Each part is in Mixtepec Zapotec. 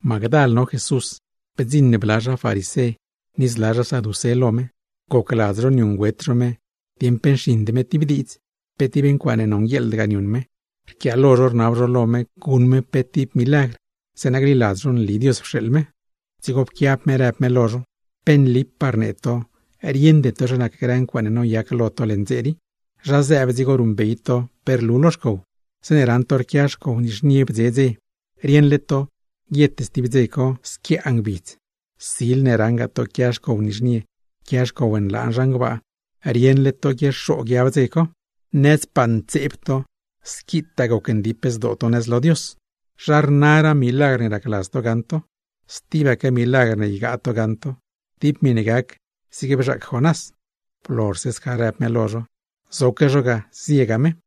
Magdal no Jesús, bdziṉ bla zha farisé ni zla zha saducé lo me, gocladz zho niuṉgüet zho me dieṉ pe nxiṉd me tib diidz, pe tib ncuaaṉe nonguieḻdgaa niuṉ me. Rquiaalo zho rnab zho lo me guṉ me pe tib milagr, zeeṉa gliladz zho nli Dios pxeeḻ me. Dzigo pquiab me rëb me lo zho: ―¡Pe nlipaa rnee to rieṉde to zha nac grë ncuaaṉe noyac leṉ dze rii! Zha zëëb dzigo ruṉbey to pe rlu lo xcow. Zeeṉe raṉ to rquia xcow nizhnie bdze dze, rieṉle to guiet stib dze co zriee lo ngbidz. Sil ne raṉgaa to quia xcow nizhnie, quia xcow nlaan zhan gbaa, rieṉle to guiexoo guiab dze co. Nazdpaa ntseeb to, squitaa gocndip zdoo to nëz lo Dios, ¿zha rnaraa milagr ne racladz to gaṉ to? Stibaque milagr goṉ gaṉ to, tib miṉe gac zigne bzhaac Jonás. Blozhse sca rëb me lo zho, zoque zho ga, ziega me.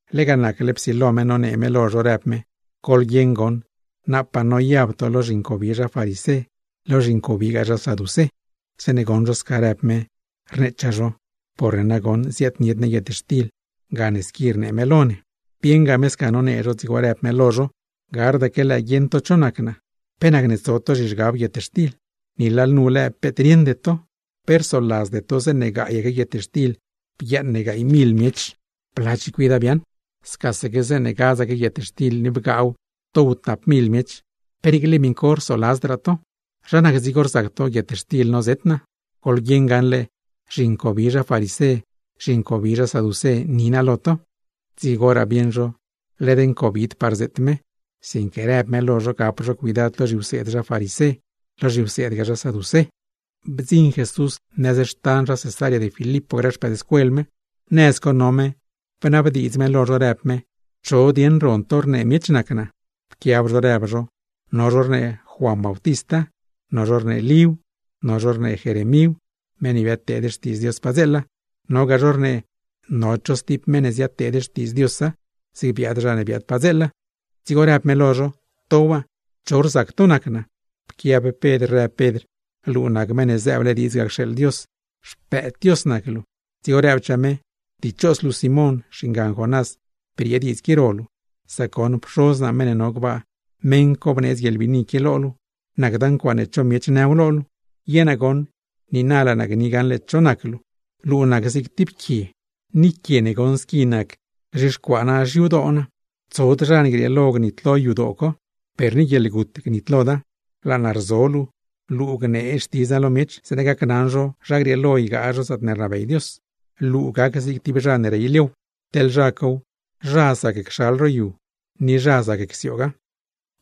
Lega nacle psilo me nonee me lo zho, rëb me: ―Goḻguieṉ goṉ, napaa noyab to lo zhincobi zha farisé, lo zhincobigaa zha saducé. Zeeṉe goṉ zho sca rëb me, rneechaa zho: ―Porne nagoṉ ziaadnied ne guietxtil, gane squi rnee me lo ne. Bieṉ me sca nonee zho, dzigo rëb me lo zho: ―¡Gardaque lëë guieṉ to cho nac naa! ¿Pe nacne tso to zhizhgab guietxtil? ¡Ni lalnu lëë peet rieṉde to! ¿Pe rsoladzde to zeeṉe gaayaque guietxtil bguiaaṉ ne gaay mil miech, bla chicuida biaaṉ? Scaque zeeṉe gadzaque guietxtil ni bgaaw dow tap mil miech, ¿pe niicle miṉ co rsoladzdraa to? ¿Zha nac dzigo rzac to guietxtil nozet naa? Goḻguieṉ gaṉle zhincobi zha farisé, zhincobi zha saducé ni naa. Dzigoraa bieṉ zho led ncobidpaa rzeet me, sinque rëb me lo zho gap zho cuidad lo zhiwseed zha farisé, lo zhiwseedgaa zha saducé. Bdziṉ Jesús nëz xtan zha Cesarea de Filipo grë xpëëdscuel me, nëz co no me bnabdiidz me lo zho rëb me: ―¿Cho dieṉ ron to rnee miech nac naa? Pquiab zho rëb zho: ―No zho rnee Juan Bautista, no zho rnee Líw, no zho rnee Jeremíw, meṉ ne biadteed xtiidz Dios padzeela; nogaa zho rnee no cho stib meṉ ne ziadteed xtiidz Diosa zig biaad zha ne biaad padzeela. Dzigo rëb me lo zho: ―¿To waa? ¿Cho rzac to nac naa? Pquiab Pedr, rëb Pedr: ―¡Luu nac Meṉ ne zëëble diidz ga cxeeḻ Dios! ¡Xpëëd Dios nac luu! Dzigo rëbchaa me: ―Dichos luu Simón (xingan Jonás) briee diidz qui ro luu, sac goṉ Pxoz naa meṉ ne no gbaa, meṉ co bneedz guieḻbiini qui lo luu, nacda ncuaaṉe cho miech nëw lo luu. Ye naa goṉ niina laa naa gni gaṉle cho nac luu, luu nac zig tib quie, ni quie ne goṉ squi nac gzhixcuaa naa xyadoo naa; tsod zha ne grieelo gnitlo yadoo co, per ni guieḻgut gnitloda. Laa naa rzo luu, luu gnee Xtidz naa lo miech zeeṉa gacnaṉ zho zha grieelo ygaa zho zaatne rnabey Dios; luu gac zig tib zha ne rey liow, teḻ zha cow, zha zac cxal ro yu, ni zha zac csiooga.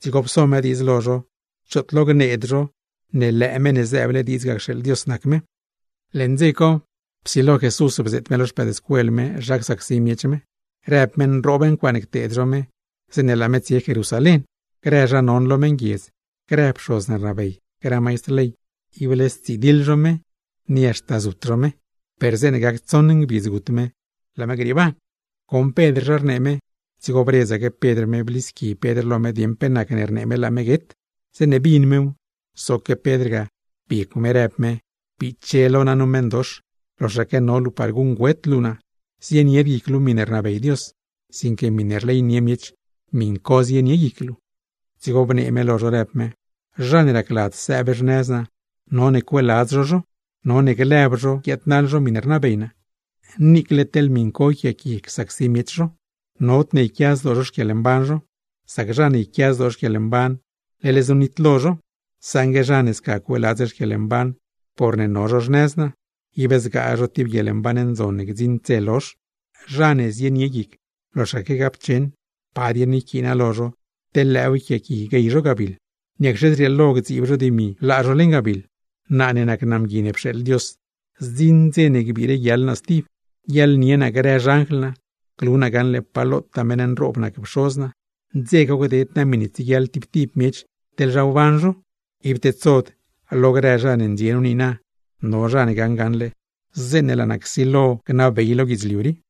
Dzigo pso me diidz lo zho choot lo gneed zho, me nac Meṉ ne zëëble diidz ga cxeeḻ Dios. Leṉ dze co psilo Jesús bzeet me lo xpëëdscuel me zha csacsi miech me. Rëb me nroob ncuaaṉe cteed zho me, zeeṉe laa me tsie Jerusalén; grë zha non lo meṉguiedz, grë pxoz ne rnabey, grë maistr ley, ible stsidiḻ zho me ni haxta zut zho me; per zeeṉe gac tsoṉ ngbidz gut me, laa me grieeban. Goṉ Pedr zha rnee me, dzigo bredzaque Pedr me blisqui Pedr lo me dieṉ pe nacne rnee me laa me guet. Zeeṉe bin mew, zoque Pedr ga, biecw me rëb me: ―¡Biche lo naa nu meṉdox! ¡Loxaque no luu par guṉgüet luu naa! Zienied guic luu miṉe rnabey Dios, sinque miṉe rleynie miech, miṉ co zienie guic luu. Dzigo bnee me lo zho, rëb me: ―Zha ne racladz sëëb xnëz naa, none cueeladz zho zho, none lëb zho guiaadnaḻ zho miṉe rnabey naa, niicle teḻ miṉ co yquiaaqui csacsi miech zho. Nodne yquia zdoo zho xquieḻmban zho, sac zha ne yquia zdoo xquieḻmban, leḻ znu nitlo zho; saṉgue zha ne sca cueeladz xquieḻmban porne no zho xnëz naa, ib zgaa zho tib guieḻmban ndzon ne gdziṉd dze lozh. Zha ne zienie guic loxaque gapcheṉ, ¿pa dieṉ yquiina lo zho, teḻ lëëw yquiaaqui guey zho gabiḻ? ¿Niacxe zrieelo gdziib zho dimi, laa zho leṉ gabiḻ? Naa ne nac naa Mgui ne pxeeḻ Dios, zdziṉ dze ne gbiire guiaḻ naa stib, guiaḻnie naa grë xanjl naa, glu naa gaṉle pa lotaa meṉ nroob nac Pxoz naa; dze co gded naa miṉe tsieguiaḻ tib tib miech, teḻ zha wban zho. Ib tedsod lo grë zha ne ndxie nu niina, bii no zha ne gaṉ gaṉle, zeeṉe laa naa csilo gnabey lo guidzliu rii.